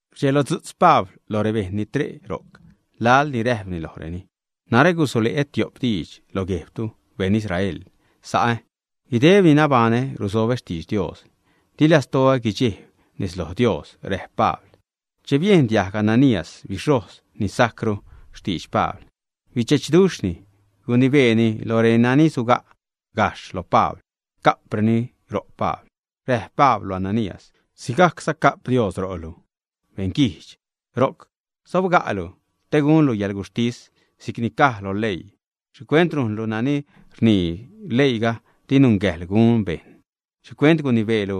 Rdxelodzu'tz Pabl lo rebejṉ ni tre' ro'c laḻ ni räjpni lojreni: ―Narä gusule'ä tiop diidx lo guejbtu, beṉ Israel, sa'ä. Guideb ni nabaṉä ruzobä xtidx Dios. Di lastoä guidxejb nez lo Dios ―räjp Pabl. Che biejn diajg Ananías, bixhojz ni sajcru, xtidx Pabl, bidxechduxhni, gunibeeni lo renani suga' gajxh lo Pabl ca'preni ro' Pabl. Räjp Pabl lo Ananías: ―Sigajcza ca'p Dios ro'lu, beṉguijdx. Ro'c sobga'lu te gunlu yäḻguxhtis si'cni caj lo leii. ¿Xhicuent rujnlu nani rnii leiiga di nungäjḻ gun bejṉ? ¿Xhicuent gunibeelu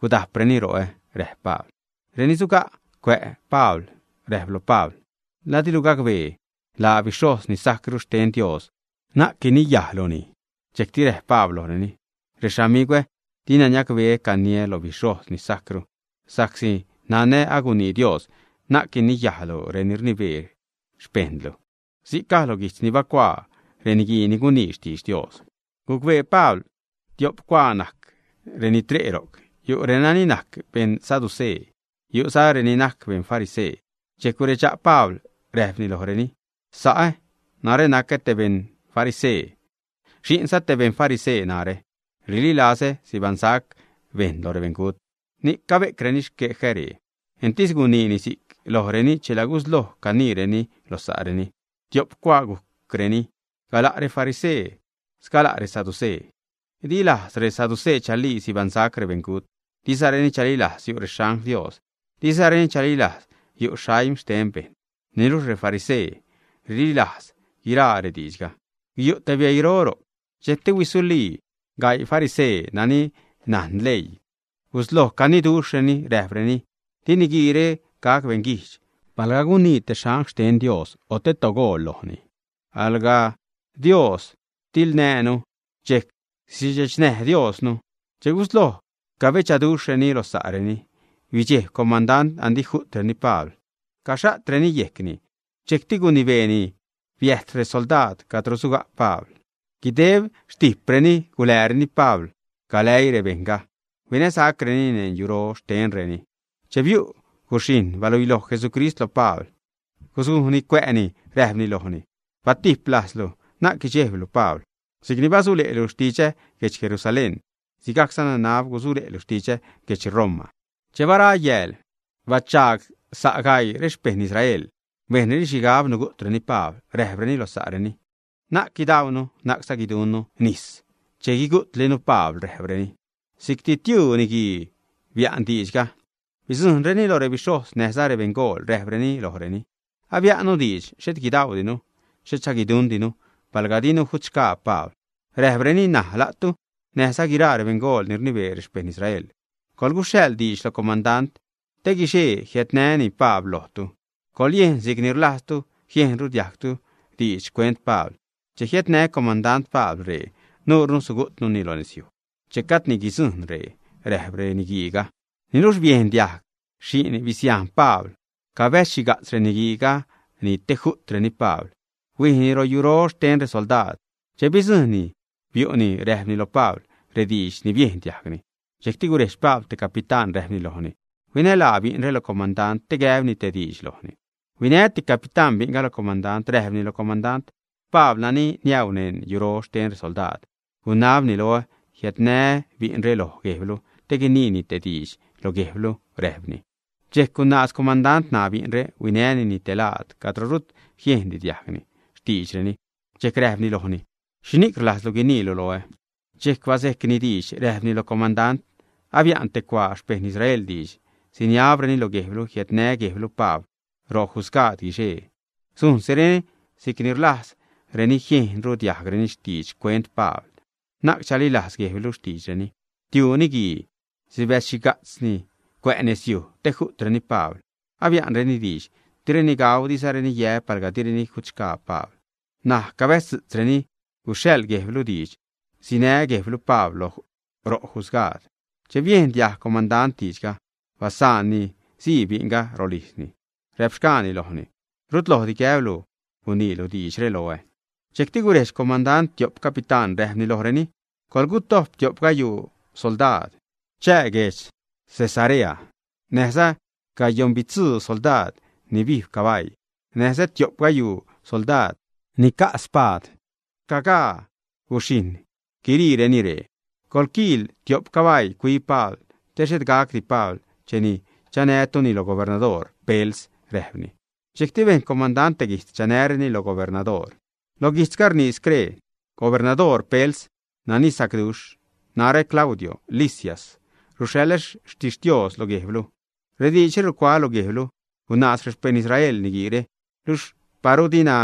guda'preni ro'ä? ―räjp Pabl. Reni suga' cuä' Pabl räjp lo Pabl: ―¿La dilu gacbee laa bixhojz ni sajcru xten Dios? Na'c guiniyajluni. Dxejcti räjp Pabl lojreni: ―Rexamigwä, dina niacbeä caniä lo bixhojz ni sajcru, sa'csi nanä agunii Dios: “Na'c guiniyajlu reni rnibee xpejṉlu.” Si'c caj lo guijtz ni bacuaa reni gunii xtidx Dios. Gucbee Pabl tiop cuaa najc reni tre' ro'c. Yu' reni najc beṉ saducee, yu'za reni najc beṉ farisee. Dxejc guredxa' Pabl räjpni lojreni: ―Sa'ä, narä nacä te beṉ farisee, xi'nza te beṉ farisee narä. Rililazä sibaṉsac bejṉ lo rebeṉgut, ni'c cabe'creni xquejä ree. Entis guniini si'c lojreni, chela gusloj caniireni lo sa'reni. Tiop cuaa gujcreni, gala' refarisee, sgala' resaducee. Di lajz resaducee chalii sibaṉsac rebeṉgut, dizareni chalilajz yu' rexangl Dios, dizareni chalilajz yu' aim xten bejṉ. Niluxh refarisee rililajz guiraa rediidxga. Guyu' te bieiro. Dxejcti huisulii gaii farisee nani najn leii, gusloj caniduxhreni, räjpreni: ―Di niguiire gac beṉguijdx. Palga gunii te angl xten Dios o te togool lojni, alga Dios tiḻnäjnu, dxejc sidxechnäj Diosnu. Che gusloj cabedxaduxhreni lo sa'reni, bidxejb comandant, andi ju'treni Pabl, caxha'treni yejcni. Dxejcti gunibeeni biäjt resoldaad cadro suga' Pabl. Guideb xtijpreni gulääreni Pabl galäii rebejṉga huinäsacrenini neṉ yuro xtenreni. Che biu' guxhijṉ, baluiloj Jesucrist lo Pabl, guzujni cuä'ni, räjpni lojni: ―Batijp lajzlu, na'c guidxejblu, Pabl. Si'cni basule'lu xtidxä guedx Jerusalén, sigajcza nanab gusule'lu xtidxä guedx Roma. Che bara yääl, bachagsa' gaii xpejṉ Israel, bejnreni xhigab nugu'treni Pabl. Räjpreni lo sa'reni: ―Na'c guidaunu, na'cza guiduṉnu nis che guigu'tlinu Pabl ―räjpreni. Si'cti tiuu niguii bia'n diidxga. Bidzujṉreni lo rebixhojz näjza rebeṉgool, räjpreni lojreni: ―Abia'nnu diidx, xhet guidaudinu, xhetza guiduṉdinu palga dinu guigutxgaa Pabl ―räjpreni―. N̲aj la'tu näjza guiraa rebeṉgool ni rnibee rexpejṉ Israel, coḻguxhaḻ diidx lo comandant te guixee jiädnäni Pabl lojtu. Coḻyejn si'c ni rlajztu jiejnru diajgtu diidx xcuent Pabl. Che jiädnä comandant Pabl ree, nuure sugu'tnuni lo nezyuj che gajdni guidzujṉ ree ―räjp reniguiiga. Niluxh biejn diajg xi'n bisiajn Pabl cabäzxhiga'tz reniguiiga te ju'treni Pabl, huijni royuro xten resoldaad. Che bidzujṉni, biu'ni räjpni lo Pabl rediidx ni biejn diajgni. Dxejcti gurejdx Pabl te capitán, räjpni lojni: ―Huinälaa bi'nre lo comandant te gäbni te diidx lojni. Huinäti capitán bi'nga lo comandant, räjpni lo comandant: ―Pabl, nani niäu neṉ yuro xten resoldaad, gunab loä jiädnälaä bi'nre lo guejblu te guiniini te diidx lo guejblu ―räjpni. Dxejc gunaaz comandant ṉaa bi'nre, huinänini te laad cadro rut jiejndi diajgni xtiidxreni, dxejc räjpni lojni: ―¿Xhini'c rlajzlu guiniilu loä? Dxejc bazejcni diidx, räjpni loj comandant: ―Abia'n te cuaa xpejṉ Israel diidx siniabreni lo guejblu jiädnä guejblu Pabl ro jusgaad guixee. Sujnsireni si'c ni rlajz jiejnru diajgreni diidx xcuent Pabl. Na'c chalilajz guejblu xtiidxreni. Tiu niguii sibäzxhiga'tz cuä' nezyuj te ju'treni Pabl. Abia'nreni diidx direni gau, dizareni yä palga direni jutxgaa Pabl. N̲aj cabäjztisreni guxhaḻ guejblu diidx sinä guejblu Pabl ro jusgaad. Che biejn diajg comandant diidxga, basaanni sii bi'nga rolijzni, räpxgaani lojni: ―Rut lojdipac gäblu guniilu diidxre loä. Dxejcti gurejdx comandant tiop capitán, räjpni lojreni: ―Coḻgutojp tiop gayuu soldaad, chää guedx Cesarea näjza gayoṉbitzuu soldaad ni bijb cabaii, näjza tiop gayuu soldaad ni ca' spaad. Rcagaa guxhijṉ guiriireni ree. Coḻquiil tiop cabaii cuib Pabl te xhet gacdi Pabl cheni chanätuni lo gubernador Pels ―räjpni. Dxejcti bejn comandant te guijtz chanäreni lo gubernadoor. Loj guijtzga rnii scree: “Gubernador Pels, nani sacduxh. Narä, Claudio Lisias, ruxhaḻä xtixtios lo guejblu. Rediidxre rucuaä́ lo guejblu. Gunaaz rexpejṉ Israel niguiire, luxh paru dina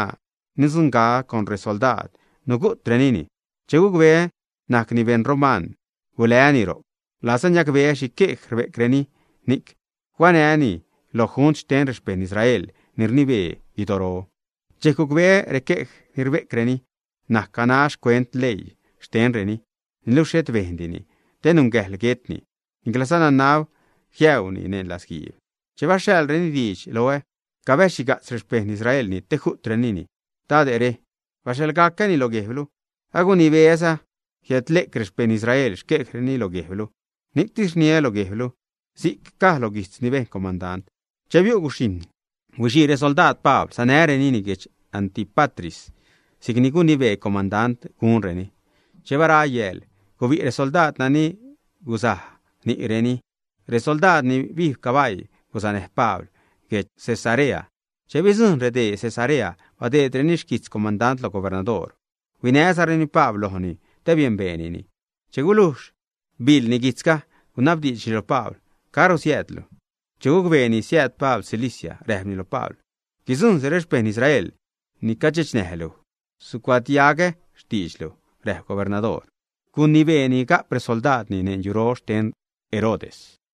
nidzuṉga'cä con resoldaad, nugu'trenini. Che gucbeä najcni beṉ roman, guläänuni ro'c. Rlazä niacbeä xhi quej rbe'creni, ni'c huanää́ni lo junt xten rexpejṉ Israel ni rnibee guidoro. Dxejc gucbeä requej ni rbe'creni najc ganax xcuent leii xtenreni, niluxh xhet bejndini te nungäjḻ guetni, niclazä nanab jiäuni neṉ latzguiib. Che baxhaḻreni diidx loä cabäzxhiga'tz rexpejṉ Israelni te ju'treni dade're, baxhaḻga'cäni lo guejblu. Agunibeä́za jiädle'c rexpejṉ Israelre xquejreni lo guejblu. Ni'ctis rniä lo guejblu”, si'c caj lo guijtz ni bejn comandant. Che biu' guxhijṉ, huixii resoldaad Pabl sanärenini guedx Antípatris si'cni gunibee comandant gunreni. Che bara yääl, gubi' resoldaad nani guzaj ni'reni. Resoldaad ni bijb cabaii guzanäj Pabl guedx Cesarea. Che bidzujṉ redee Cesarea, badeedreni xquijtz comandant lo gubernadoor, huinäzareni Pabl lojni te biembeenini. Che gulujx biḻni guijtzga, gunabdiidxni lo Pabl: ―¿Caro siäädlu? Che gucbeeni siääd Pabl Cilicia, räjpni lo Pabl: ―Guidzujṉsi rexpejṉ Israel ni cadxechnäj luj, sucuadiaggacä xtiidxlu ―räjp gubernadoor. Gunibeeni ga'p resoldaadni neṉ yuro xten Herodes.